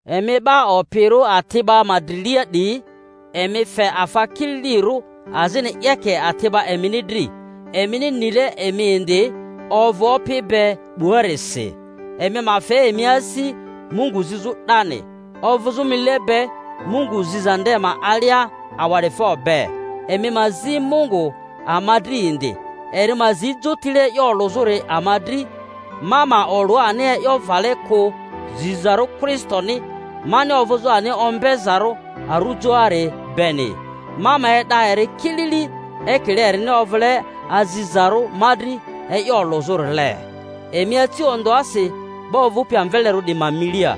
Emi 'ba opirᴜ ati'ba ma drilia 'diyi, emi fe afa kililirᴜ azini 'yeke ati'ba emini dri, emini nile emi indi ovᴜ Opi be 'buarisi. Emi ma fe emi asi Mungu zizᴜ 'dani, ovᴜzᴜ mile be Mungu ziza nde ma alia awa'difo be; emi ma zi Mungu ama dri indi, eri ma zi jotile e'yo olᴜzᴜri ama dri, ma ma olᴜ ani e'yo vale kᴜ zizarᴜ Kristoni mani ovᴜzᴜ ani ombezarᴜ arujoari beni, ma ma e'da eri kilili, ekile erini ovᴜle azizarᴜ ma dri e'yo olᴜzᴜrile. Emi aci ondᴜasi 'ba ovᴜpi amvelerᴜ 'diyi ma milia,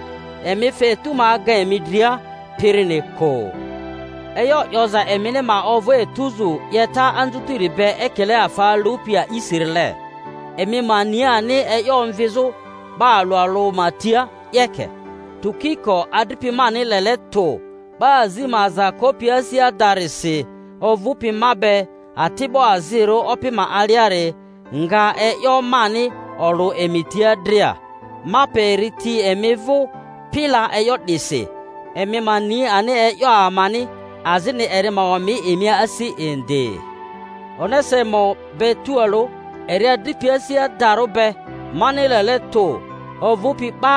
emi fe etu ma aga emi dria pirini kᴜ. E'yo 'yoza emini ma ovᴜ etuzu 'yeta anzutiri be ekile afa alupi a'isirile, emi ma ni ani e'yo omvizᴜ 'ba alᴜ alᴜ ma tia 'yeke. Tukiko adripi mani lele tᴜ, 'ba azi ma aza kopi asi adarisi, ovᴜpi ma be ati'bo azirᴜ Opi ma aliari nga e'yo mani olᴜ emi tia dria. Ma pe eri ti emi vᴜ pila e'yo 'disi, emi ma ni ani e'yo amani, azini eri ma omi emi asi indi, Onesimo be tualᴜ, eri adripi asi adarᴜ be mani lele tᴜ, ovᴜpi 'ba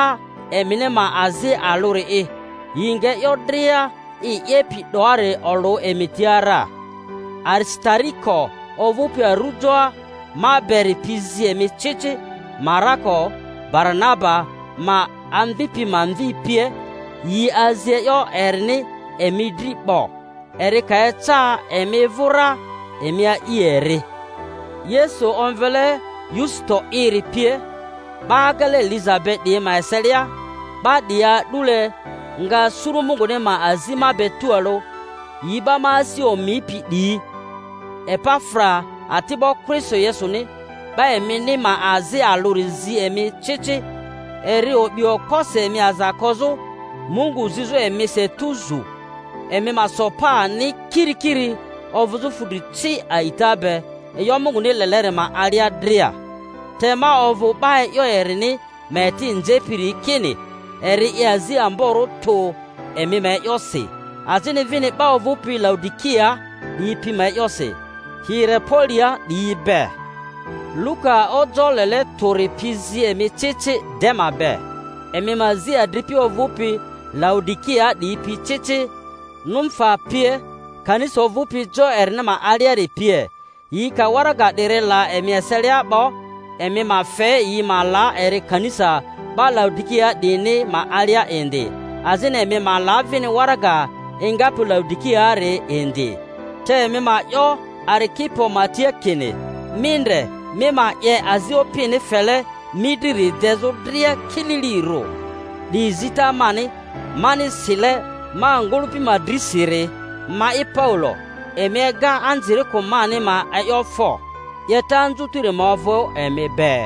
emini ma azi alᴜri'i. Yi nga e'yo dria i 'yepi 'doari olᴜ emi tia ra. Arisitariko ovᴜpi arujoa ma beri pi zi emi ci ci, Marako Baranaba ma amvipi ma mvi pie (yi azi e'yo erini emi dri 'bo—eri ka eca emi vᴜ ra emi a'i eri), Yesu omvele Yusito'iri pie. 'Ba agele liza be 'diyi ma eselia, 'ba 'diyi a'dule nga suru Munguni ma azi ma be tualᴜ, yi 'ba ma asi omipi 'diyi. Epafra ati'bo Kristo Yesuni, 'ba emini ma azi alᴜri zi emi ci ci; eri o'bi okposi emi aza kozᴜ, Mungu zizᴜ emisi etuzu, emi ma so pa ani kirikiri ovᴜzᴜ fudri ci a'ita be eyo Munguni leleri ma alia dria. Te ma ovᴜ 'ba e'yo erini ma eti nzepiri kini, eri 'ye azi amborᴜ tᴜ emi ma e'yosi, azini vini 'ba ovᴜpi Laodikiaa 'diyi pi ma e'yosi, Hierapolia 'diyi be. Luka ojoᴜ lele tᴜri pi zi emi ci ci Dema be. Emi ma zi adripi ovᴜpi Laodikiaa 'diyi pi ci ci, Numfa pie, kanisa ovᴜpi jo erini ma aliari pie. Yi ka waraga 'diri la emi eselia 'bo, emi ma fe yi ma la eri kanisa 'ba Laodikiaa 'diyini ma alia indi; azini emi ma la vini waraga engapi Laodikiaari indi. Te emi ma 'yo Arikipo ma tia kini, Mi ndre mi ma 'ye azi Opini fele mi driri dezᴜ dria kililirᴜ. 'Di zita mani, mani sile ma ngᴜlᴜpi ma drisiri, ma'i Paulo. Emi ega anzirikᴜ mani ma e'yo fo! 'Yeta anzutiri ma ovᴜ emi be.